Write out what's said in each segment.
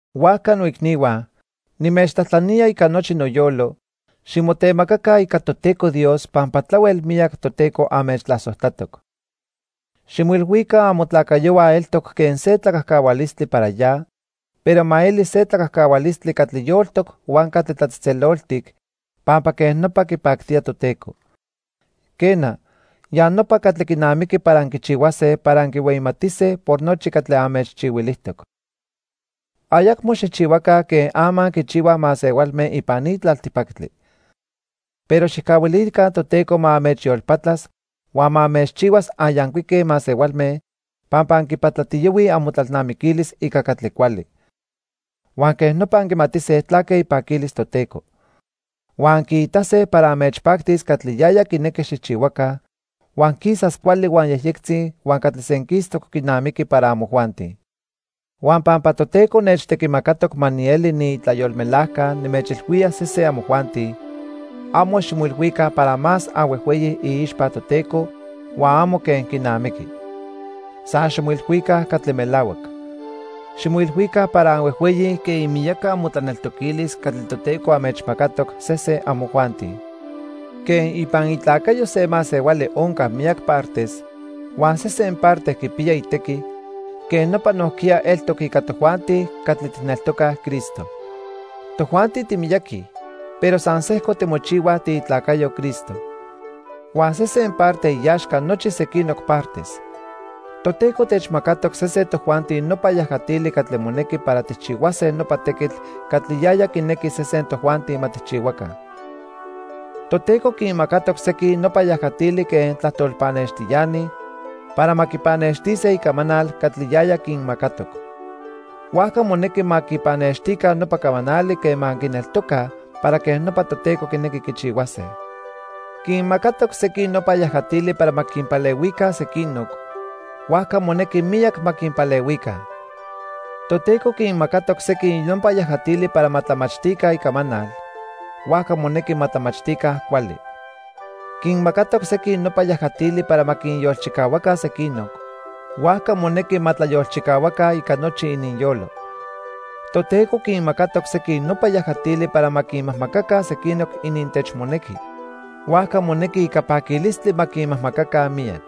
Huajca noicnihua, nimechtlajtlanía ica nochi noyolo, ximotemacaca ica Toteco Dios pampa tlahuel miyac Toteco anmechtlasojtlatoc. Ximoilhuica amotlacayohua eltoc quen se tlacajcahualistli para ya, pero ma eli se tlacajcahualistli catli yoltoc huan catli tlatzejtzeloltic, pampa quej nopa quipactía Toteco. Quena, ya nopa catli quinamiqui para anquichihuase para anquihueyimatise por nochi catli anmechchihuilijtoc. Ayacmo xijchihuaca quen ama quichihuaj masehualme ipan ni tlaltipactli. Pero xijcahuilica Toteco ma anmechyolpatlas huan ma anmechchihuas anyancuique masehualme pampa anquipatlatiyohuij amotlalnamiquilis ica catli cuali. Huan quej nopa anquimatise tlaque ipaquilis Toteco. Huan anquiitase para anmechpactis catli yaya quinequi xijchihuaca, huan quisas cuali huan yejyectzi huan catli senquistoc quinamiqui para amojuanti. Huan pampa Toteco nechtequimacatoc ma nieli niitlayolmelajca nimechilhuía sesen amojuanti, amo ximoilhuica para más anhuejhueyi iixpa Toteco huan amo quen quinamiqui. San ximoilhuica catli melahuac. Ximoilhuica para anhuejhueyi quen imiyaca amotlaneltoquilis catli Toteco anmechmacatoc sesen amojuanti. Quen ipan itlacayo se masehuali onca miyac partes, huan sesen parte quipiya itequi, quej nopa nojquiya eltoc ica tojuanti catli tijneltocaj Cristo. Tojuanti timiyaqui, pero san sejco timochihuaj tiitlacayo Cristo. Huan sesen parte iaxca nochi sequinoc partes. Toteco techmacatoc sesen tojuanti nopa yajatili catli monequi para tijchihuase nopa tequitl catli yaya quinequi sesen tojuanti ma tijchihuaca. Toteco quinmacatoc sequin nopa yajatili quen tlajtol pannextiani para ma quipannextise icamanal catli yaya quinmacatoc. Huajca monequi ma quipannextica nopa camanali quema quineltocaj para quej nopa Toteco quinequi quichihuase. Quinmacatoc sequin nopa yajatili para ma quinpalehuica sequinoc, huajca monequi miyac ma quinpalehuica. Toteco quinmacatoc sequin nopa yajatili para ma tlamachtica Icamanal, huajca monequi ma tlamachtica cuali. Quinmacatoc sequin nopa yajatili para ma quinyolchicahuaca sequinoc, huajca monequi ma tlayolchicahuaca ica nochi ininyolo. Toteco quinmacatoc sequin nopa yajatili para ma quinmajmacaca sequinoc inintechmonequi, huajca monequi ica paquilistli ma quinmajmacaca miyac.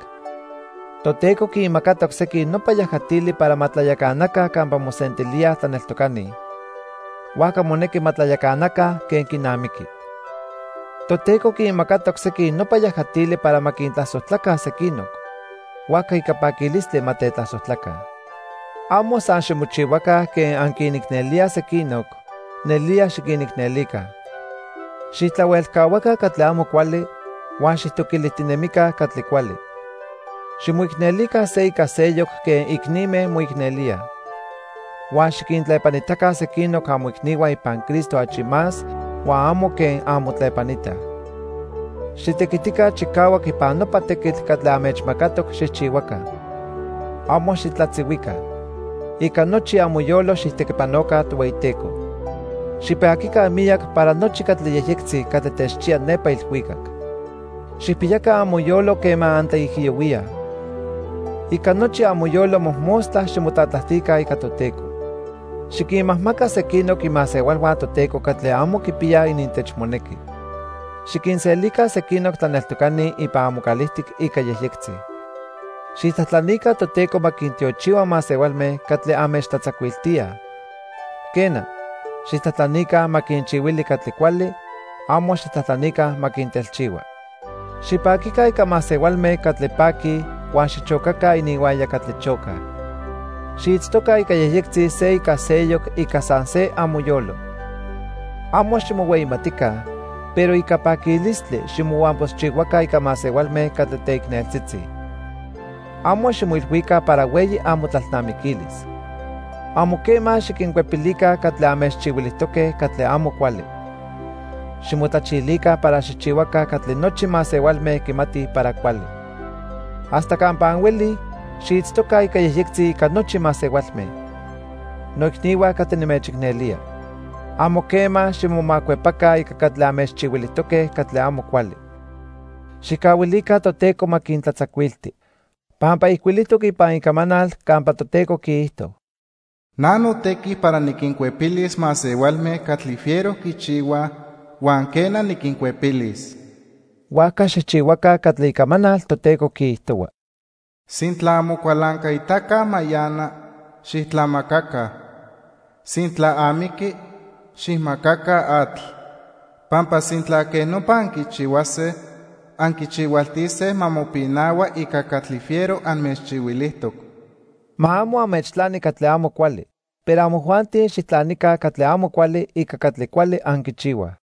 Toteco quinmacatoc sequin nopa yajatili para ma tlayacanaca campa mosentilíaj tlaneltocani, huajca monequi ma tlayacanaca quen quinamiqui. Toteco quinmacatoc sequin nopa yajatili para ma quintlasojtlaca sequinoc, huajca ica paquilistli ma tetlasojtlaca. Amo san ximochihuaca quen anquinicnelíaj sequinoc, nelía xiquinicnelica. Xijtlahuelcahuaca catli amo cuali huan xijtoquilijtinemica catli cuali. Ximoicnelica se ica seyoc quen icnime moicnelíaj. Huan xiquintlepanitaca sequinoc amoicnihua ipan Cristo achi más huan amo quen anmotlepanitaj. Xitequitica chicahuac ipan nopa tequitl catli anmechmacatoc xijchihuaca. Amo xitlatzihuica. Ica nochi amoyolo xijtequipanoca Tohueyiteco. Xipaquica miyac para nochi catli yejyectzi catli techchiya nepa ilhuicac. Xijpiyaca amoyolo quema antlaijiyohuíaj. Ica nochi amoyolo mojmostla ximotlatlajtica ica Toteco. Xiquinmajmaca sequinoc imasehualhua Toteco catli amo quipiyaj inintechmonequi. Xiquinselica sequinoc tlaneltocani ipan amocalijtic ica yejyectzi. Xijtlajtlanica Toteco ma quintiochihua masehualme catli anmechtlatzacuiltíaj. Quena, xijtlajtlanica ma quinchihuili catli cuali, amo xijtlajtlanica ma quintelchihua. Xipaquica ica masehualme catli paquij huan xichocaca ininhuaya catli chocaj. Xiitztoca ica yejyectzi se ica seyoc ica san se amoyolo. Amo ximohueyimatica, pero ica paquilistli ximohuampoxchihuaca ica masehualme catli teicneltzitzi. Amo ximoilhuica para hueyi amotlalnamiquilis. Amo quema xiquincuepilica catli anmechchihuilijtoque catli amo cuali. Ximotlachilica para xijchihuaca catli nochi masehualme quimatij para cuali. Hasta campa anhuelij, xiitztoca ica yejyectzi ica nochi masehualme. Noicnihua catli nimechicnelía. Amo quema ximomacuepaca ica catli anmechchihuilijtoque catli amo cuali. Xijcahuilica Toteco ma quintlatzacuilti. Pampa ijcuilijtoc ipan Icamanal campa Toteco quiijto: "Na notequi para niquincuepilis masehualme catli fiero quichihuaj huan quena, niquincuepilis." Huajca xijchihuaca catli Icamanal Toteco quiijtohua: "Sintla amocualancaitaca mayana, xijtlamacaca. Sintla amiqui, xijmacaca atl. Pampa sintla quej nopa anquichihuase, anquichihualtise ma mopinahua ica catli fiero anmechchihuilijtoc." Ma amo anmechtlani catli amo cuali. Pero amojuanti xijtlanica catli amo cuali ica catli cuali anquichihuaj.